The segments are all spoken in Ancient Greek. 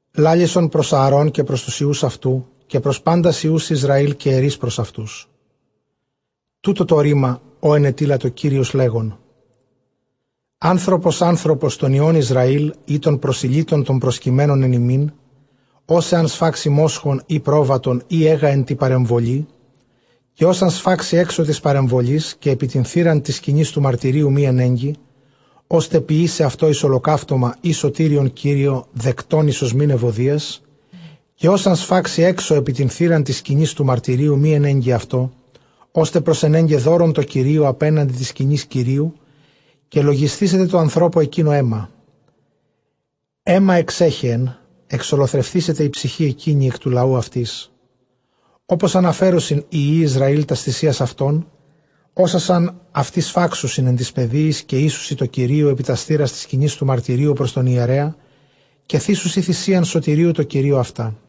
λάλησον πρὸς Ἀαρὼν καὶ πρὸς τοὺς υἱοὺς αὐτοῦ, καὶ πρὸς πάντας υἱοὺς Ἰσραὴλ, καὶ ἐρεῖς πρὸς αὐτοὺς, τοῦτο τὸ ῥῆμα ὃ ἐνετείλατο Κύριος, λέγων, ἄνθρωπος ἄνθρωπος τῶν υἱῶν Ἰσραὴλ, ἢ τῶν προσηλύτων τῶν προσκειμένων ἐν ὑμῖν, ὃς ἐὰν σφάξῃ μόσχον, ἢ πρόβατον, ἢ αἶγα ἐν τῇ παρεμβολῇ, καὶ ὃς ἂν σφάξῃ ἔξω τῆς παρεμβολῆς, καὶ ἐπὶ τὴν θύραν τῆς σκηνῆς τοῦ μαρτυρίου μὴ ἐνέγκῃ, ὥστε ποιῆσαι αὐτὸ εἰς ὁλοκαύτωμα ἢ σωτήριον Κυρίῳ δεκτὸν εἰς ὀσμὴν εὐωδίας· καὶ ὃς ἂν σφάξῃ ἔξω, καὶ ἐπὶ τὴν θύραν τῆς σκηνῆς τοῦ μαρτυρίου μὴ ἐνέγκῃ αὐτὸ, ὥστε προσενέγκαι δῶρον τῷ Κυρίῳ ἀπέναντι τῆς σκηνῆς Κυρίου· καὶ λογισθήσεται τῷ ἀνθρώπῳ ἐκείνῳ αἷμα· αὶμα ἐξέχεεν· ἐξολοθρευθήσεται ἡ ψυχὴ ἐκείνη ἐκ τοῦ λαοῦ αὐτῆς. Ὅπως ἀναφέρωσιν οἱ υἱοὶ Ἰσραὴλ τὰς θυσίας αὐτῶν, ὅσας ἂν αὐτοὶ σφάξουσιν ἐν τοῖς πεδίοις, καὶ οἴσουσι τῷ Κυρίῳ ἐπὶ τὰς θύρας τῆς σκηνῆς τοῦ μαρτυρίου πρὸς τὸν ἱερέα· καὶ θύσουσι θυσίαν σωτηρίου τῷ Κυρίῳ αὐτά.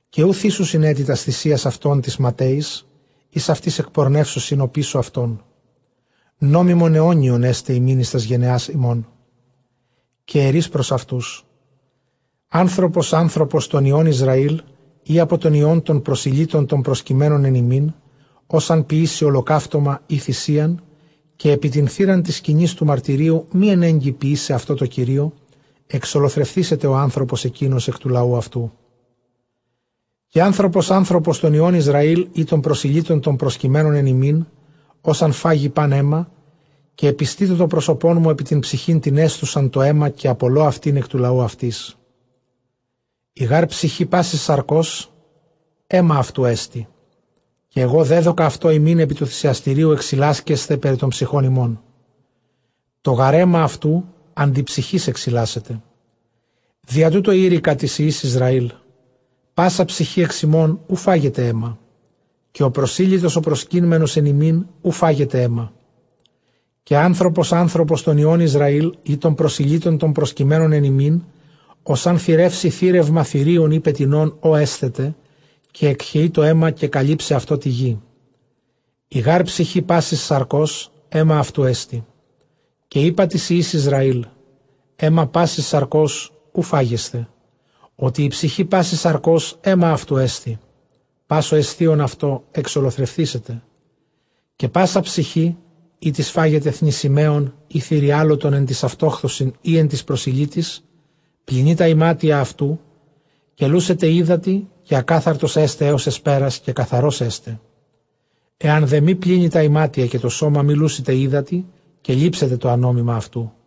Καὶ οὐ θύσουσιν ἔτι τὰς θυσίας αὐτῶν τοῖς ματαίοις, οἷς αὐτοὶ ἐκπορνεύουσιν ὀπίσω αὐτῶν· νόμιμον αἰώνιον ἔσται ὑμῖν εἰς τὰς γενεὰς ὑμῶν. Καὶ ἐρεῖς πρὸς αὐτοὺς, ἄνθρωπος ἄνθρωπος τῶν υἱῶν Ἰσραὴλ, ἢ ἀπὸ τῶν υἱῶν τῶν προσηλύτων τῶν προσκειμένων ἐν ὑμῖν, ὃς ἂν ποιήσῃ ὁλοκαύτωμα ἢ θυσίαν, καὶ ἐπὶ τὴν θύραν τῆς σκηνῆς τοῦ μαρτυρίου μὴ ἐνέγκῃ ποιῆσαι αὐτὸ τῷ Κυρίῳ, ἐξολοθρευθήσεται ὁ ἄνθρωπος ἐκεῖνος ἐκ τοῦ λαοῦ αὐτοῦ. Καὶ ἄνθρωπος ἄνθρωπος τῶν υἱῶν Ἰσραὴλ, ἢ τῶν προσηλύτων τῶν προσκειμένων ἐν ὑμῖν, ὃς ἂν φάγῃ πᾶν αἷμα· καὶ ἐπιστήσω τὸ πρόσωπόν μου ἐπὶ τὴν ψυχὴν τὴν ἔσθουσαν τὸ αἷμα, καὶ ἀπολῶ αὐτὴν ἐκ τοῦ λαοῦ αὐτῆς. Ἡ γὰρ ψυχὴ πάσης σαρκὸς αἷμα αὐτοῦ ἐστι· καὶ ἐγὼ δέδωκα αὐτὸ ὑμῖν ἐπὶ τοῦ θυσιαστηρίου ἐξιλάσκεσθαι περὶ τῶν ψυχῶν ὑμῶν· τὸ γὰρ αἷμα αὐτοῦ ἀντὶ ψυχῆς ἐξιλάσεται. Διὰ τοῦτο εἴρηκα τοῖς υἱοῖς Ἰσραὴλ, πᾶσα ψυχὴ ἐξ ὑμῶν οὐ φάγεται αἷμα· καὶ ὁ προσήλυτος ὁ προσκείμενος ἐν ὑμῖν οὐ φάγεται αἷμα. Καὶ ἄνθρωπος ἄνθρωπος τῶν υἱῶν Ἰσραὴλ, ἢ τῶν προσηλύτων τῶν προσκειμένων ἐν ὑμῖν, ὃς ἂν θηρεύσῃ θήρευμα θηρίον ἢ πετεινὸν, ὃ ἔσθεται, καὶ ἐκχεεῖ τὸ αἷμα, καὶ καλύψει αὐτὸ τῇ γῇ. Ἡ γὰρ ψυχὴ πάσης σαρκὸς αἷμα αὐτοῦ ἐστι· καὶ εἶπα τοῖς υἱοῖς Ἰσραὴλ, αἷμα πάσης σαρκὸς οὐ φάγεσθε, ὅτι ἡ ψυχὴ πάσης σαρκὸς αἷμα αὐτοῦ ἐστί· πᾶς ὁ ἔσθων αὐτὸ, ἐξολοθρευθήσεται. Καὶ πᾶσα ψυχὴ, ἥτις φάγεται θνησιμαῖον, ἢ θηριάλωτον ἐν τοῖς αὐτόχθοσιν, ἢ ἐν τοῖς προσηλύτοις, πλυνεῖ τὰ ἱμάτια αὐτοῦ, καὶ λούσεται ὕδατι, καὶ ἀκάθαρτος ἔσται ἕως ἑσπέρας, καὶ καθαρὸς ἔσται. Ἐὰν δὲ μὴ πλύνῃ τὰ ἱμάτια, καὶ τὸ σῶμα μὴ λούσηται ὕδατι, καὶ λήψεται ἀνόμημα αὐτοῦ.